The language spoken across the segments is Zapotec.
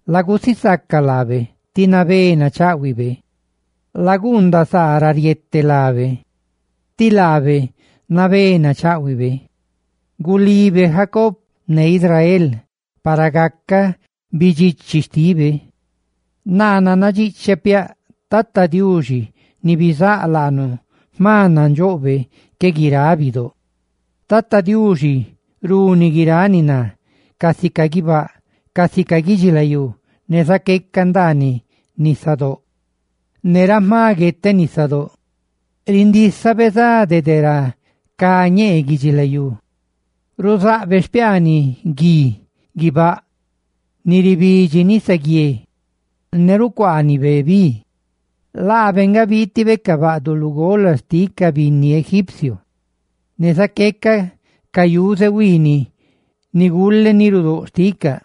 Lagusisaca Tata Diuxi, tí laa nachaꞌhuiꞌ; laguundaꞌ saa ra riete lábe, tí laabe nabé nachaꞌhuibe. Gulibe Jacob, Israel, para gacaꞌ bidxichi xtípebe. Naa nannadxiꞌcheꞌ piaꞌ Tata Diuxi, Diuxi ni bizáꞌ laanu, jma nandxoꞌbe que guiráꞌ bidóꞌ. Tata Diuxi runi guiráꞌ ni ná, casica guibáꞌ casica guidxilayú, ne zaqueca ndaaniꞌ nisadóꞌ dede ra jma gueteꞌ. Rindísabe za dede ra cá ñee guidxilayú, ruzaꞌbe xpiaaniꞌ gui guibáꞌ ni ribidxi nisaguié, ne ribeebe bi dede ra riaapaꞌ. Laabe nga biitibe ca baꞌduꞌ lugola xtiꞌ ca binni egipcio ne zaqueca ca yuze huiiniꞌ ni gule nirudóꞌ xticaꞌ.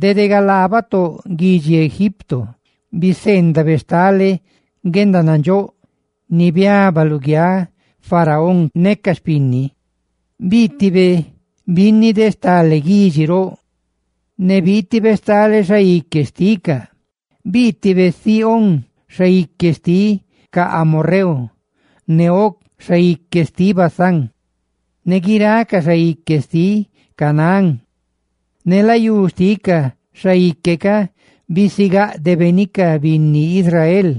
Dede galaa batóꞌ guidxi Egipto, biseendabe stale guendanandxóꞌ ni biaba luguiáꞌ faraón ne ca xpinni. Biitibe binni de stale guidxi roꞌ, ne biitibe stale xaique roꞌ xticaꞌ: biitibe Sihón, xaique xtiꞌ ca amorreu, ne Og, xaique xtiꞌ Basán, ne guiráꞌ ca xaique xtiꞌ Canaán; ne layú xtiꞌ ca xaique ca bisigáꞌdebe ni ca binni Israel.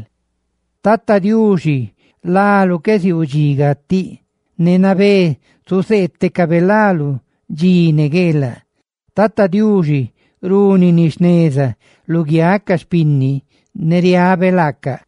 Tata Diuxi láluꞌ qué ziuu dxi gatiꞌ; ne nabé zuzeetecabe láluꞌ dxi ne gueelaꞌ. Tata Diuxi runi ni jneza luguiáꞌ ca xpinni; ne riabe laacaꞌ.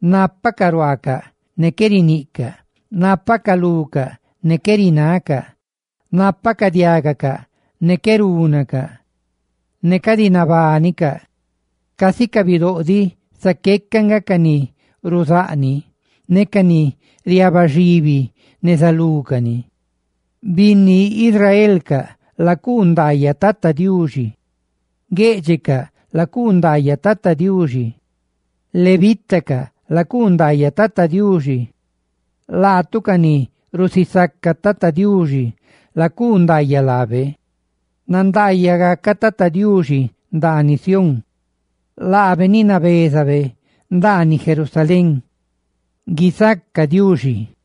Nápacaꞌ ruaacaꞌ, ne qué riniꞌcaꞌ; nápacaꞌ lucaꞌ, ne qué rinacaꞌ; nápacaꞌ diágacaꞌ, ne qué rúnacaꞌ; ¡ne cadi nabánicaꞌ! Casi ca bidóꞌ diꞌ zaqueca nga ca ni ruzaꞌ cani ne ca ni riabaxibi neza lúcani. Binni Israelcaꞌ, lacuu ndaayaꞌ Tata Diuxi; gueꞌdxeꞌcaꞌ, lacuu ndaayaꞌ Tata Diuxi; levitacaꞌ, lacuu ndaayaꞌ Tata Diuxi; Laatu ca ni rusisaca Tata Diuxi, lacuu ndaayaꞌ laabe. ¡Nandaayaꞌ gacaꞌ Tata Diuxi ndaaniꞌ Sión laabe nabézabe ndaaniꞌ Jerusalén! ¡Guisaca Diuxi!